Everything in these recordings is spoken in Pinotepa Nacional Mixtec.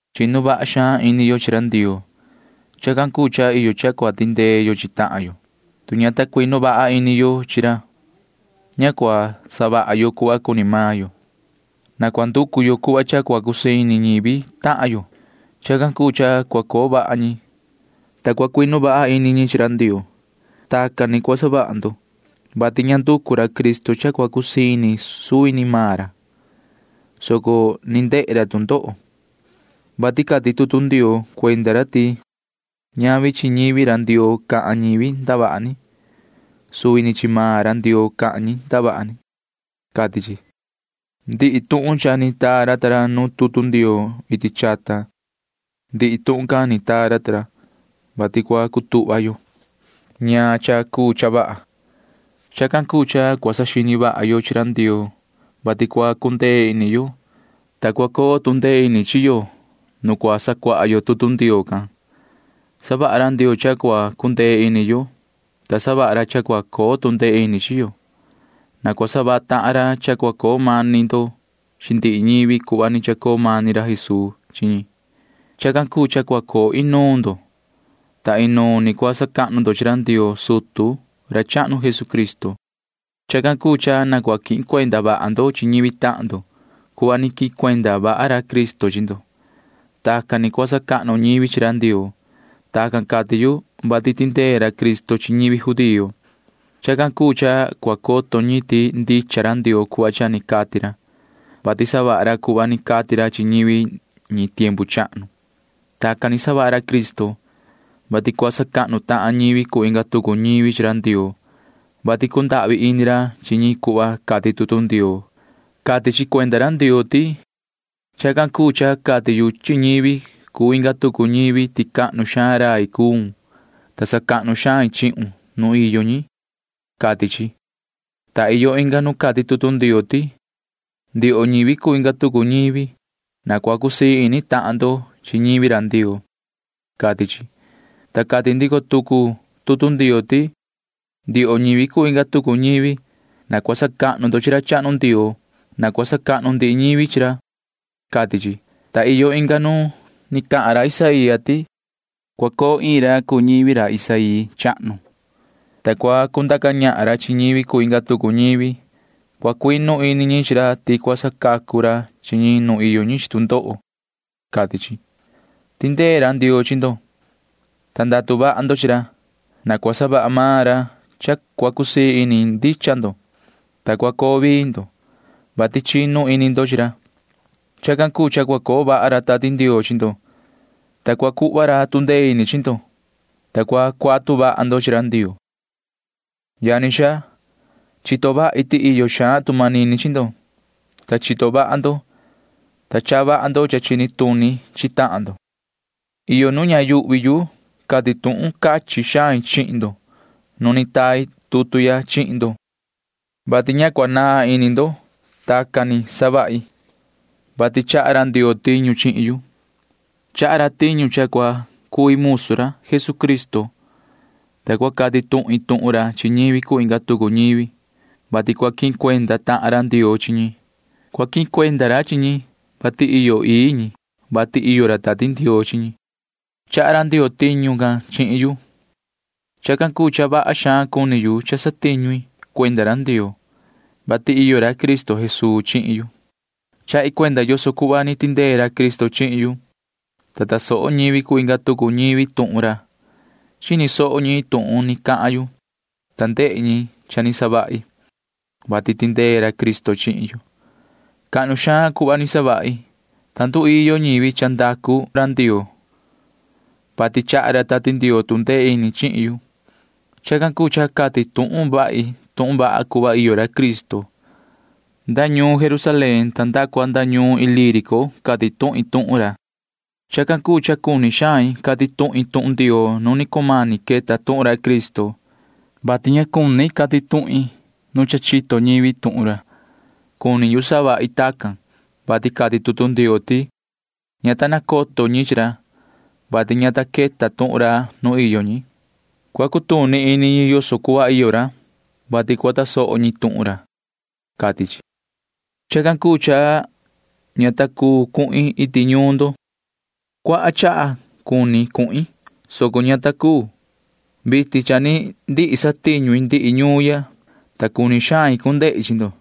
Chinu vaha xaan ini yo chi ra Ndioo. Chacan cuu cha iyo cha cua tindee yo chi tahan yo, tu ña ta cuinu vaha ini ñi chi ra. Ña cua savaha yo cuhva cuni maan yo. Na cua nducu yo cuhva cha cua cusii ini ñivi tahan yo. Chacan cuu cha cua coo vaha ñi, ta cua cuinu vaha ini ñi chi ra Ndioo. Tacan ni cua savaha ndo, vati ña ni nducu ra Cristo cha cua cusii ini suvi ni maan ra, [soco ni ndehe ra tu ndoho,] vati cati tutu Ndioo cuenda ra ti ñavi chihin ñivi ra Ndioo cahan ñivi ndavaha ni, soco chi suvi ni maan ra Ndioo cahan ñi ndavaha ni, cati chi. Ndihi tuhun cha ni taa ra ta ra nu tutu Ndioo iti chata―ndihi tuhun can ni taa ra ta ra, vati cua cutuhva yo [ñaan cha cuu cha vaha]. Chacan cuu cha cua saxini vaha yo chi ra Ndioo, vati cua cundee ini yo, ta cua coo tu ndee ini chi yo nu cua sacuaha yo tutu Ndioo can. Savaha ra Ndioo cha cua cundee ini yo, ta savaha ra cha cua coo tu ndee ini chi yo. Na cua savaha tahan ra cha cua coo mani ndo chi ndihi ñivi cuhva ni chacoo mani ra Jesuu chi ñi. Chacan cuu cha cua coo inuun ndo, ta inuun ni cua sacahnu ndo chi ra Ndioo sutu ra chahnu Jesucristo. Chacan cuu cha na cua quihin cuenda vaha ndo chi ñivi tahan ndo cuhva ni quihin cuenda vaha ra Cristo chi ndo. Tacan ni cua sacahnu ñivi chi ra Ndioo. Tacan cati yu, vati tindee ra Cristo chi ñivi judío. Chacan cuu cha cua coto ñi ti ndicha ra Ndioo cuhva cha ni cati ra, vati savaha ra cuhva ni cati ra chi ñivi ñi tiempu chahnu. Tacan ni savaha ra Cristo, vati cua sacahnu tahan ñivi cuu inga tucu ñivi chi ra Ndioo, vati cundahvi ini ra chi ñi cuhva cati tutu Ndioo. Cati chi cuenda ra Ndioo ti: Chacan cuu cha cati yu chi ñivi cuu inga tucu ñivi ti cahnu xaan rai cuun, ta sacahnu xain chihun nu iyo ñi, cati chi. Ta iyo inga nu cati tutu Ndioo ti: Ndioho ñivi cuu inga tucu ñivi, na cua cusii ini tahan ndo chi ñivi Ndioo, cati chi, ta cati ndico tucu tutu Ndioo ti: Ndioho ñivi cuu inga tucu ñivi, na cua sacahnu ndo chi ra chahnu Ndioo. Na cua sacahnu ndihi ñivi chi ra, cati chi, ta iyo inga nu ni cati ra Isaía ti: Cua coo iin ra cuu ñivi ra Isaí chahnu, ta cua cundaca ñahan ra chi ñivi cuu inga tucu ñivi. Cua cuinu ini ñi chi ra ti cua sacacu ra chi ñi nu iyo ñi chi tu ndoho, cati chi. Tindee ra Ndioo chi ndo, ta ndatu vaha ndo chi ra. Na cua savaha maan ra cha cua cusii ini ndicha ndo, ta cua coo vii ndo, vati chinu ini ndo chi ra. Chacan cuu cha cua coo vaha ra Tati Ndioo chi ndo, ta cua cuhva ra tu ndee ini chi ndo, ta cua cuatu vaha ndo chi ra Ndioo. Yani xaa, chito vaha xain ti iyo xaan tu manini chi ndo, ta chito vaha xaan ndo, ta chaha vaha ndo cha chini tuni chi tahan ndo. Iyo nu ña yuhvi yu cati tuhun cachin xain chihin ndo nu ni tai tutu ya chihin ndo, vati ña cua naan ini ndo. Tacan ni savahi, vati chaha ra Ndioo tiñu chihin yu. Chaha ra tiñu cha cua cui musu ra Jesucristo, ta cua cati tuhin tuhun ra chi ñivi cuu inga tucu ñivi, vati cua quihin cuenda tahan ra Ndioo chi ñi. Cua quihin cuenda ra chi ñi, vati iyo ii ñi, vati iyo ra Tati Ndioo chi ñi. [Chaha ra Ndioo tiñu can chihin yu.] Chacan cuu cha vaha cuni yu cuenda cha satiñu yu cuenda ra Ndioo, vati iyo ra Cristo Jesuu chihin yu. Chahi cuenda yoso cuhva ni tindee ra Cristo chihin yu, ta tasoho ñivi cuu inga tucu ñivi tuhun ra. Chini soho ñi tuhun ni cahan yu, ta ndehe ñi cha ni savahi, vati tindee ra Cristo chihin yu. Cuhva cahnu xaan ni savahi, ta nduiyo ñivi cuhva iyo ra Ndioo, vati chaha ra Tati Ndioo tu ndee ini chihin yu. Chacan cuu cha cati tuhun vahi tuhun vaha yoso cuhva iyo ra Cristo. Nda ñuun Jerusalén ta nda cua nda ñuun Ilírico cati tuhin tuhun ra. Chacan cuu cha cuni xain cati tuhin tuhun Ndioo nu ni cumani queta tuhun ra Cristo, vati ña cuni cati tuhin nu cha ni chito ñivi tuhun ra. Cuni yu savahi tacan, vati cati tutu Ndioo ti: Ña ta nacoto ñi chi ra, vati ña ta queta tuhun ra nuun ñi. Cua cutuni ini ñi yoso cuhva iyo ra, vati cua tasoho ñi tuhun ra, cati chi. Chacan cuu cha ña ta cuu cuhin iti ñuun ndo. Cuaha chaha cuni cuhin, soco ña ta cuu. Vitin cha ni ndihi satiñu i ndihi ñuun ya, ta cuni xain cu ndehi chi ndo.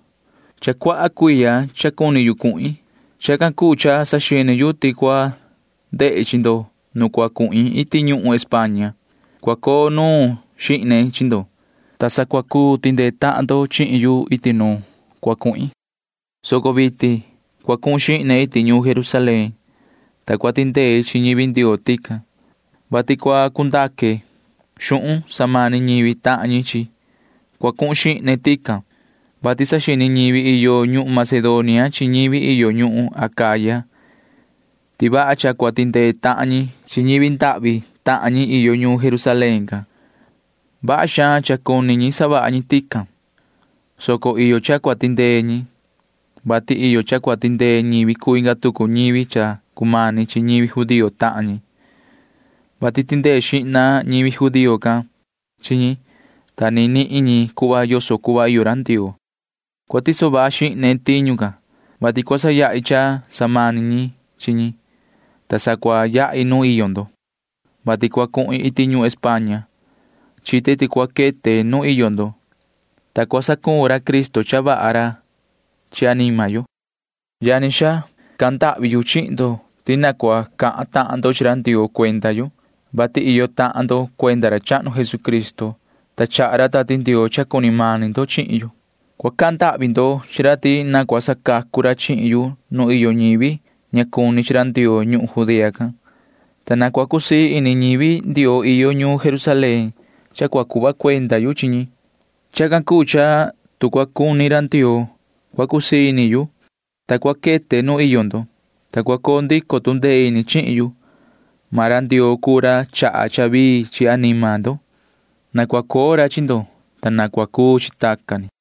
Cha cuaha cuiya iyo cha cuni yu cuhin. Chacan cuu cha saxini yu ti cua ndehi chi ndo nu cua cuhin iti ñuhun España. Cua coo nuun xihne chi ndo, ta sa cua cuu tindee tahan ndo chihin yu iti nuun cua cuhin, soco vitin cua cuhun xihne iti ñuun Jerusalén, ta cua tindei chi ñivi Ndioo tican, vati cua cu ndaque xuhun samani ñivi tahan ñi chi ñi. Cua cuhun xihne tican, vati saxini ñivi iyo ñuhun Macedonia chi ñivi iyo ñuhun Acaya ti vaha cha cua tindee tahan ñi chi ñivi ndahvi tahan ñi iyo ñuun Jerusalén can. Vaha xaan cha cuni ñi savaha ñi tacan, soco iyo cha cua tindee ñi, vati iyo cha cua tindee ñivi cuu inga tucu ñivi cha cumani chi ñivi judío tahan ñi, vati tindee xihna ñivi judío can chi ñi, ta ni nihin ñi cuhva yoso cuhva iyo ra Ndioo. Cua tiso vaha xihne tiñu can, vati cua sayahi cha samani ñi chi ñi, ta sa cua yahi nu iyo ndo, vati cua cuhin iti ñuhun España. Chite ti cua quete nu iyo ndo, ta cua saquehni ra Cristo cha vaha chi anima yo. Yani xaa, cahan ndahvi yu chihin ndo ti na cua cahan tahan ndo chi ra Ndioo cuenda yu, vati iyo tahan ndo cuenda ra chahnu Jesucristo, ta chaha ra Tati Ndioo cha cuni mani ndo chihin yu. Cua cahan ndahvi ndo chi ra ti na cua sacacu ra chihin yu nu iyo ñivi ña cuni chi ra Ndioo ñuhun Judea can, ta na cua cusii ini ñivi Ndioo iyo ñuun Jerusalén cha cua cuhva cuenda yu chi ñi. Chacan cuu cha tu cua cuni ra Ndioo, cua cusii ini yu, ta cua quete nu iyo ndo, ta cua coo ndico tu ndee ini chihin yu. Maan ra Ndioo cuu ra chaha cha vii chi anima ndo. Na cua coo ra chi ndo, ta na cua cuu chi tacan ni.